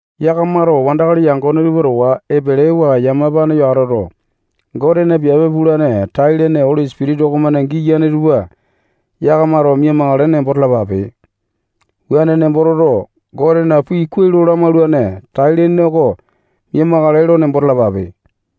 Yakamato wandakali yangone tupa towa epelewa yamapane yo atoto, Gotena piape pulane tai-lene Oli Sipitisa okomane giyane tupa yakamato mia-makale nembo talapape. Wuane nembo toto, Gotena pii kuai lo lamaulane tai-lene oko miaima lakae lo nembo talapape.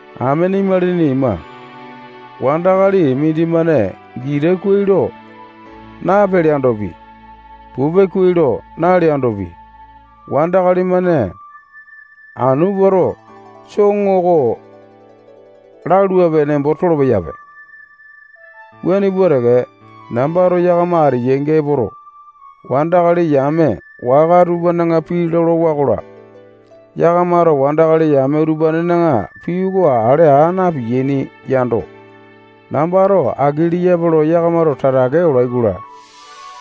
Amene imalini ima, wandakali mindimane gita kuai lo napeleandopi, pupe kuai lo naleandopi, wandakali-mane anu puato, soŋo oko laluape nembo tolo-peyape. Wuane pua teke, nambato yakama ateyainga epoto, wandakali yame waka tupana pii lolowa-kola, yakamato wandakali yame utupanena pii oko ale aa na-piyaini yando, nambato aki leyape lo yakamato tatake olailoka,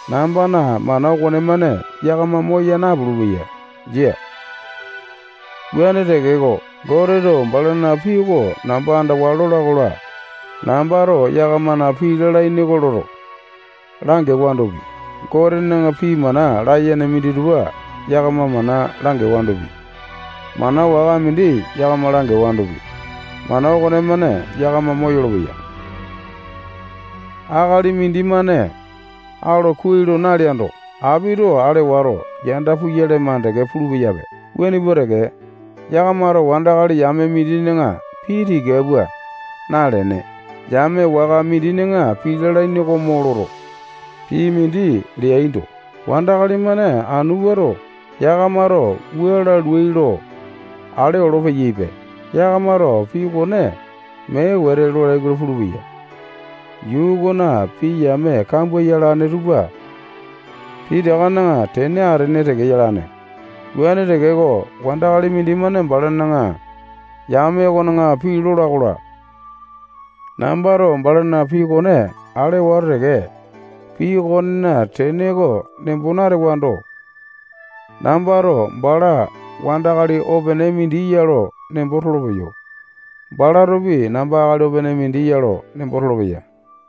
nambana mana okonemane yakama moya napulu-peya. Jia. Wuane tekeko, Goteto balana pii oko namba andawa lola-kola, nambato yakamana pii lalaini oko loto, langewandopi, Gotena pii mana layene minditupa yakama mana langewandopi, mana waka mindi yakama langewandopi, mana okonemane yakama moyolo-peya. Akali mindimane alo kuai lo naleando, apito ale wato, yanda puyale makande pulu-peyape. Wuane pua teke, yakamato wandakali yame mindina pii tika pua nalene, yame waka mindina pii lalaini oko mo loto, pii mindi leaindo, wandakali-mane anu puato, yakamato wua laluai lo ale olo-peyaipe. Yakamato pii okone mee wete lolai-kola pulupeya. Yuu okona pii yame kambua yalane tupa pitakana tene atene teke yalane. Wuane tekeko, wandakali mindimane balana yame okona pii lola-kola, nambato balana pii okone ale wato teke, pii okonena tene oko nembo natewando, nambato bala wandakali opene mindi ya lo nembo tolopeyo. Balatopi namba akali opene mindi ya lo nembo tolopeya.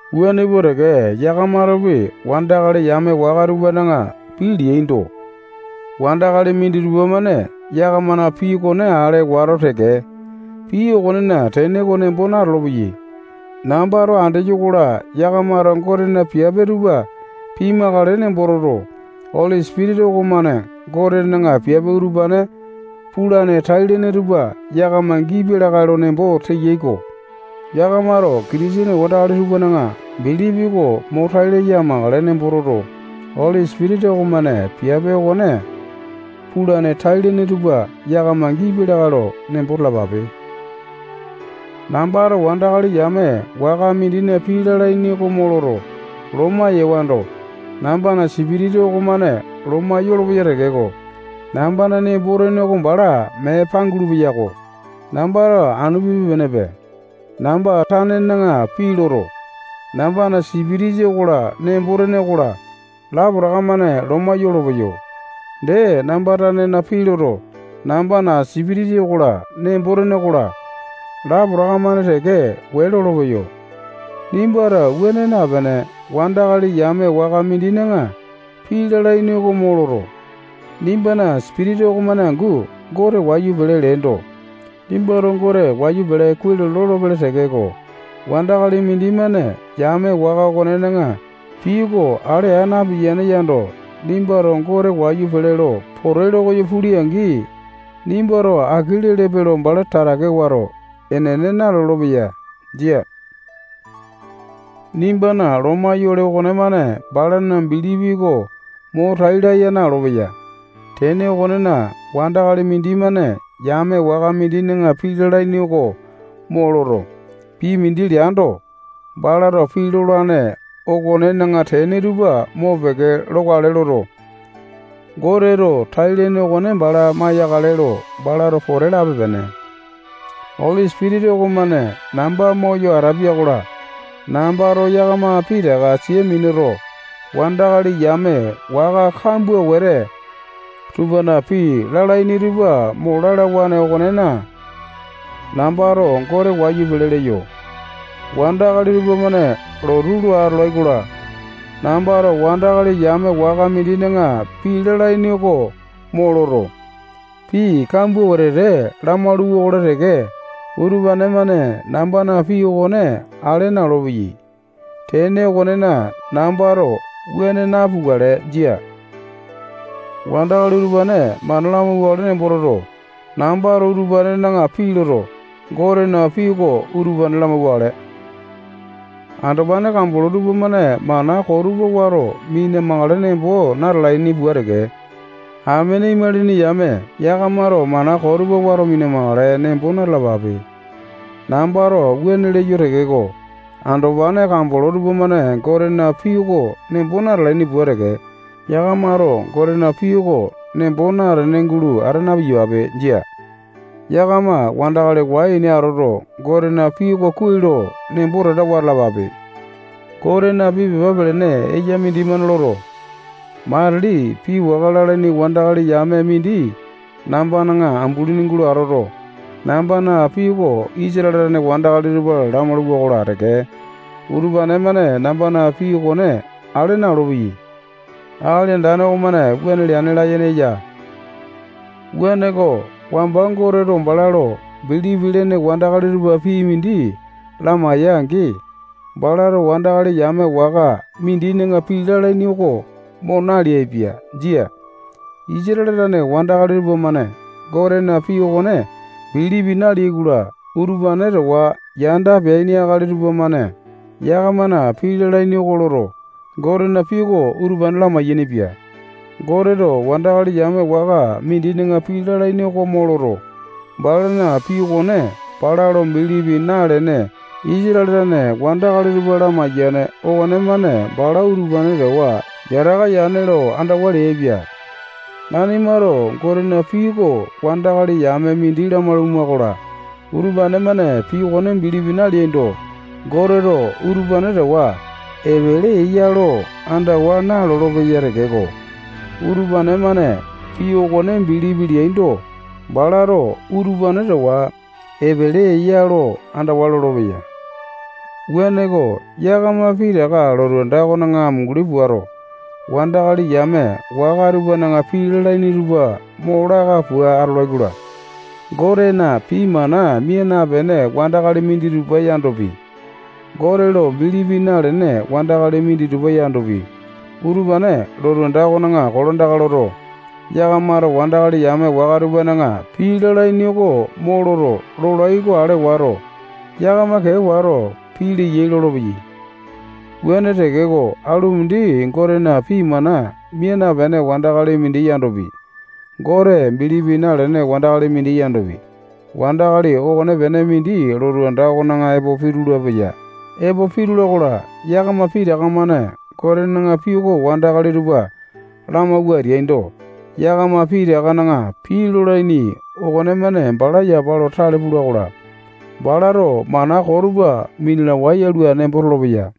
Wuane pua teke, yakamatopi wandakali yame waka tupana pii leaindo, wandakali minditupa-mane yakamana pii okone ale wato teke, pii okonena tene oko nembo natolo-peyai. Nambato andeyo-kola, yakamato Gotena piape tupa pimakale nembo toto, Oli Sipitisa okomane Gotena piape utupane pulane tai-lene tupa yakama gipia lakae lo nembo teyai-ko. Yakamato Kitisene wandalali tupana bilipi oko mo tai laya amakale nembo toto, Oli Sipitisa okomane piape okone pulane tai-lene tupa yakama gipia lakae lo nembo talapape. Nambato wandakali yame waka mindina pii lalaini oko mo loto, loma yewando, nambana sipitisa okomane loma yolopeya tekeko, nambana nembo-tene oko bala mee pangulu-peyako. Nambato anu pipe-penepe. Namba tanena pii loto, nambana sipitisa okola, nembo-tene okola, lapotaka-mane loma yolopeyo. Dee, namba tanena pii loto, nambana sipitisa okola, nembo-tene okola, lapotaka-mane teke wee lolopeyo. Nimbato wuane napene, wandakali yame waka mindina pii lalaini oko mo loto, nimbana sipitisa okomane angu Gote wayu pele leendo, nimbato Gote wayu pele kuai lo lolopele tekeko, wandakali mindimane yame waka okonena pii oko ale aa napiyane yando, nimbato Gote wayu pele lo pote lokoyo pule-angi, nimbato aki lelepe lo bala tatake wato, enene nalolo-peya. Jia. Nimbana loma yolene okonemane balana bilipi oko mo tai laya na-olopeya. Tene okonena, wandakali mindimane yame waka mindina pii lalaini oko mo loto, pii mindi leando, balato pii lolane okonena tene tupa mopeke lokale loto, Goteto tai-lene okone bala maiyakale lo balato pote lape-pene. Oli Sipitisa okomane namba moyo ateya-kola, nambato yakama pitaka sia minuto, wandakali yame waka kambua wete tupana pii lalaini tupa mo lalawane okonena, nambato Gote wayu pele leyo. Wandakali tupamane lotu lo atolai-kola, nambato wandakali yame waka mindina pii lalaini oko mo loto, pii kambua wetete lamalu-wakola teke, utupane-mane nambana pii okone ale na-olopeyai. Tene okonena, nambato wuane napukale. Jia. Wandakali utupane mana lamauwakale nembo toto, nambato utupanena pii loto, Gotena pii oko utupane lamauwakale. Andopane kambolo tupamane mana koo tupa wato mina-makale nembo natalaini pua teke, amene imalini yame yakamato mana koo tupa wato mina-makale nembo na-talapape. Nambato wuane leyo tekeko, andopane kambolo tupamane Gotena pii oko nembo natalaini pua teke, yakamato Gotena pii oko nembo natene gulo ata na-piyapape. Jia. Yakama wandakali wai-ene atoto, Gotena pii oko kuai lo nembo tatawa atalapape. Gotena pii pepa pelene eya mindimane loto, matili pii waka lalaini wandakali yame mindi nambana ambulini gulo atoto, nambana pii oko Isatale tane wandakali tupa lamaulai-kola teke, utupane-mane nambana pii okone ale na-olopeyai. Akali Andane okomane wuane leane layene eya. Wuaneko, wamba Goteto bala lo bilipi lene wandakali tupa pii mindi lamaeya-angi, balato wandakali yame waka mindina pii lalaini oko mo naleaipia. Jia. Isatale tane wandakali tupamane Gotena pii okone bilipi naleai-kola, utupane towa yanda peaini akali tupamane yakamana pii lalaini oko loto, Gotena pii oko utupane lamai-yainipia. Goteto wandakali yame waka mindina pii lalaini oko mo loto, balana pii okone bala lo bilipi nalene Isatale tane wandakali tupa lamaiyane okonemane bala utupane towa yataka yane lo andawa leaipia. Nanimato Gotena pii oko wandakali yame mindi lamaulama-kola, utupane-mane pii okone bilipi naleaindo, Goteto utupane towa epele eya lo andawa nalolo-peya tekeko, utupane-mane pii okone bilipi leaindo, balato utupane towa epele eya lo andawa lolopeya. Wuaneko, yakama pitaka lotu anda okona amunguli puato, wandakali yame waka tupana pii lalaini tupa mo laka pua atolai-kola, Gotena pii mana mia napene wandakali minditupa yandopi, Gote lo bilipi nalene wandakali minditupa yandopi, utupane lotu anda okona kolandaka loto, yakamato wandakali yame waka tupana pii lalaini oko mo loto leyai oko ale wato, yakama kee wato, pii leyai lolopeyai. Wuane tekeko, alu mindi Gotena pii mana mia napene wandakali mindi yandopi, Gote bilipi nalene wandakali mindi yandopi, wandakali okonepene mindi lotu anda okona epo pitulu-peya. Epo pitula-kola, yakama pitaka-mane Gotena pii oko wandakali tupa lamawua ateaindo, yakama pitakana pii lolaini okonemane bala yapa lo tale pula-kola, balato mana koo tupa minalawae yalua nembo tolopeya.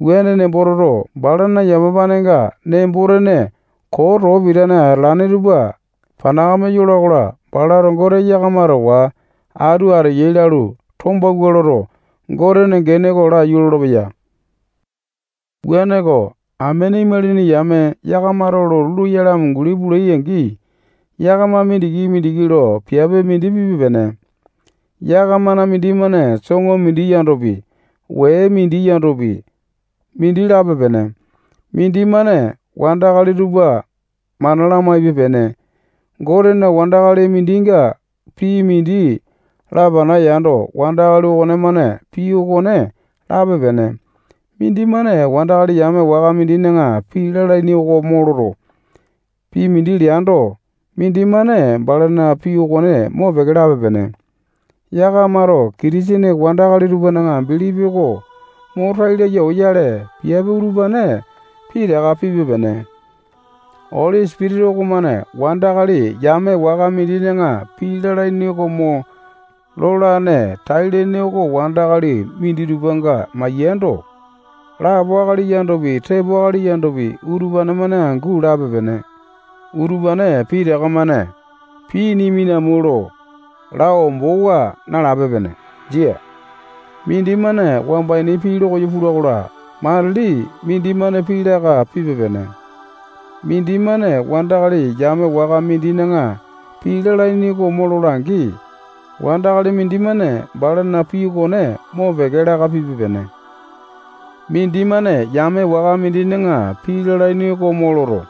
Wuane nembo toto, balana yamapanenga nembo-tene koo too pitane atalane tupa panakame yola-kola, balato Gote yakama towa atu ateya lalu, tombawua loto, Gotena gene oko laiyu lolopeya. Wuaneko, amene imalini yame yakamato lotu loyale amunguli pulai-angi, yakama mindiki-mindiki lo piape mindi pipe-pene. Yakamana mindimane soŋo mindi yandopi, wee mindi yandopi, mindi lape-pene. Mindimane wandakali tupa mana lamaipe-pene. Goteto wandakali mindinga pii mindi lapana yando, wandakali okonemane pii okone lape-pene. Mindimane wandakali yame waka mindina pii lalaini oko mo loto, pii mindi leando, mindimane balana pii okone mopeke lape-pene. Yakamato Kitisene wandakali tupana bilipi oko mo tai laya oyale, piape utupane pitaka pipe-pene. Oli Sipitisa okomane wandakali yame waka mindina pii lalaini oko mo lolane tai-lene oko wandakali minditupanga maiyando, lapo akali yandopi, tepo akali yandopi, utupane-mane angu lape-pene. Utupane pitaka-mane pii nimi nami lo laa ombowa nalape-pene. Jia. Mindimane wamba ini pii lokoyo pula-kola, matili mindimane pii laka pipe-pene. Mindimane wandakali yame waka mindina pii lalaini oko mo lola-angi, wandakali mindimane balana pii okone mopeke laka pipe-pene. Mindimane yame waka mindina pii lalaini oko mo loto,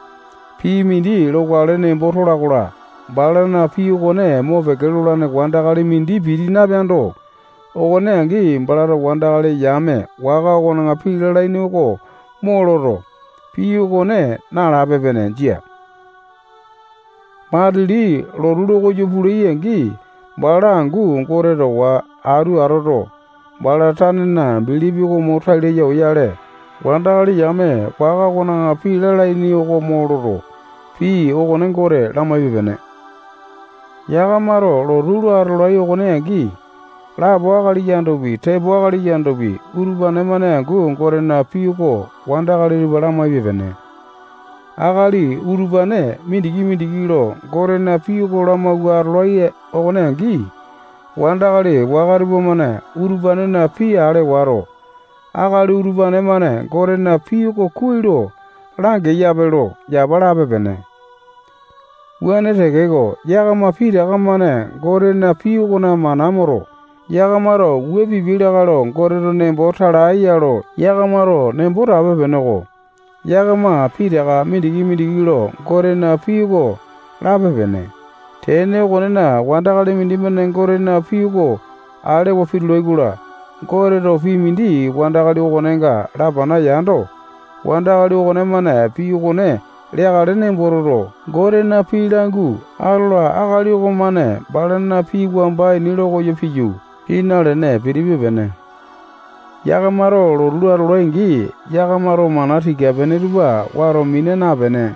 pii mindi lokale nembo tola-kola, balana pii okone mopeke lolane wandakali mindi piti napeando, okone angi, balato wandakali yame waka okona pii lalaini oko mo loto, pii okone nalape-pene. Jia. Matili lotu lokoyo pulai-angi, bala angu Gote towa atu atoto, bala tanena bilipi oko mo tai laya oyale, wandakali yame waka okona pii lalaini oko mo loto, pii okone Gote lamaipe-pene. Yakamato lotu lo atolai okone angi, lapo akali yandopi, tepo akali yandopi, utupane-mane angu Gotena pii oko wandakali tupa lamaipe-pene. Akali utupane mindiki-mindiki lo Gotena pii oko lamawua atolai okone angi, wandakali waka tupamane utupanena pii ale wato, akali utupane-mane Gotena pii oko kuai lo langeyape lo yapa lape-pene. Wuane tekeko, yakama pitaka-mane Gotena pii okona mana moto, yakamato wua pipia lakae lo Goteto nembo tala ya lo yakamato nembo tape-peneko. Yakama pitaka mindiki-mindiki lo Gotena pii oko lape-pene. Tene okonena, wandakali mindimane Gotena pii oko alewa pitula-kola, Goteto pii mindi wandakali okonenga lapana yando, wandakali okonemane pii okone leakale nembo toto, Gotena pii langu atola akali okomane balana pii wamba ini lokoyo piyu, pii nalene pitipe-pene. Yakamato lotu lo atolai-angi, yakamato mana tika-pene tupa wato mina napene,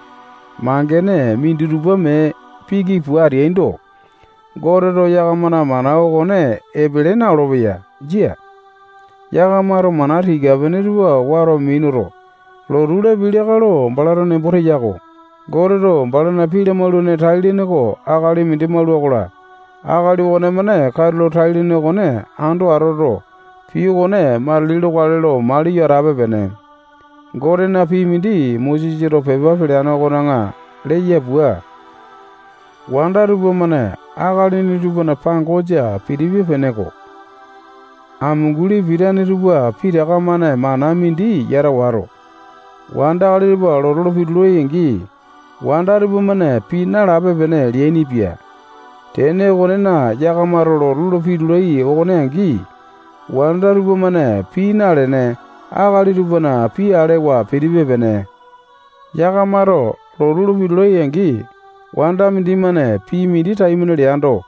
mangene minditupa mee piki pua ateaindo, Goteto yakamana mana okone epele na-olopeya. Jia. Yakamato mana tika-pene tupa wato minuto, lotu lapiai lakae lo balato nembo teya-ko. Goteto balana pii lamaulane tai-lene oko akali mindi maula-kola, akali okonemane katulo tai-lene okone ando atoto, pii okone matili lokale lo maliyo atape-pene. Gotena pii mindi Mosesato pepa peleane okona leya pua, wanda tupamane akalini tupana pangosa pitipe-peneko. Amunguli pitane tupa pitaka-mane mana mindi yata wato, wandakali tupa lotu lo pitulai-angi, wanda tupamane pii nalape-pene leainipia. Tene okonena, yakamato lotu lo pitulai okone angi, wanda tupamane pii nalene, akali tupana pii alewa pitipe-pene. Yakamato lotu lo pitulai-angi, wanda mindimane pii mindi taimane leando,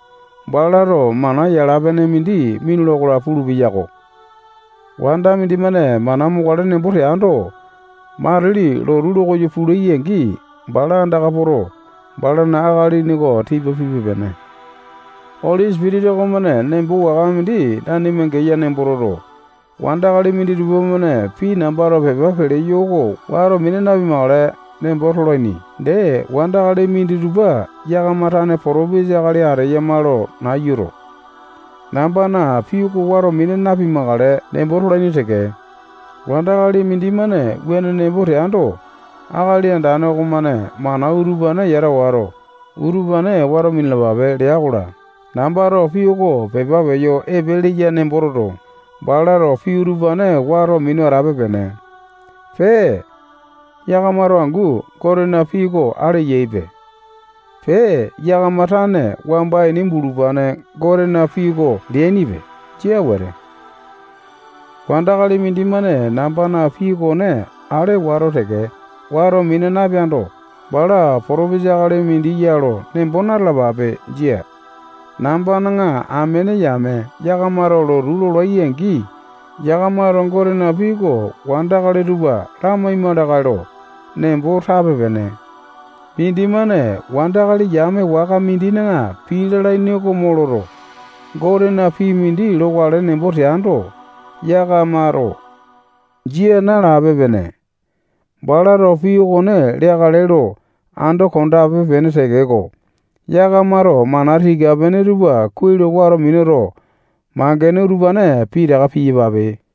balato mana yala-pene mindi minula-kola pulu-peyako. Wanda mindimane mana mokale nembo teando, matili lotu lokoyo pulai-angi, bala andaka poto, balana akalini oko tipa pipe-pene. Oli Sipitisa okomane nembo waka mindi nanima geya nembo toto, wandakali minditupa-mane pii nambato pepa peleyo oko wato mina napimakale nembo tolaini. Dee, Wandakali minditupa yakama tane potopesa akali ateyama lo nayuto, nambana pii oko wato mina napimakale nembo tolaini teke. Wandakali mindimane wuane nembo teando, Akali Andane okomane mana utupane yata wato, utupane wato minalapape lea-kola, nambato pii oko pepa peyo epe leya nembo toto, balato pii utupane wato minu atape-pene. Pee, yakamato angu Gotena pii oko ale yaipe. Pee, yakama tane wamba ini bulupane Gotena pii oko leainipe. Jia wete. Wandakali mindimane nambana pii okone ale wato teke, wato mina napeando, bala potopisa akali mindi ya lo nembo na-talapape. Jia. Nambana amene yame yakamato lotu lolai-angi, yakamato Gotena pii oko wandakali tupa lamaima lakae lo nembo tape-pene. Mindimane wandakali yame waka mindina pii lalaini oko mo loto, Gotena pii mindi lokale nembo teando, yakamato jia nalape-pene. Balato pii okone leakale lo ando kondape-pene tekeko, yakamato mana tika-pene tupa kuai lo wato minuto, mangene utupane pitaka piyapape.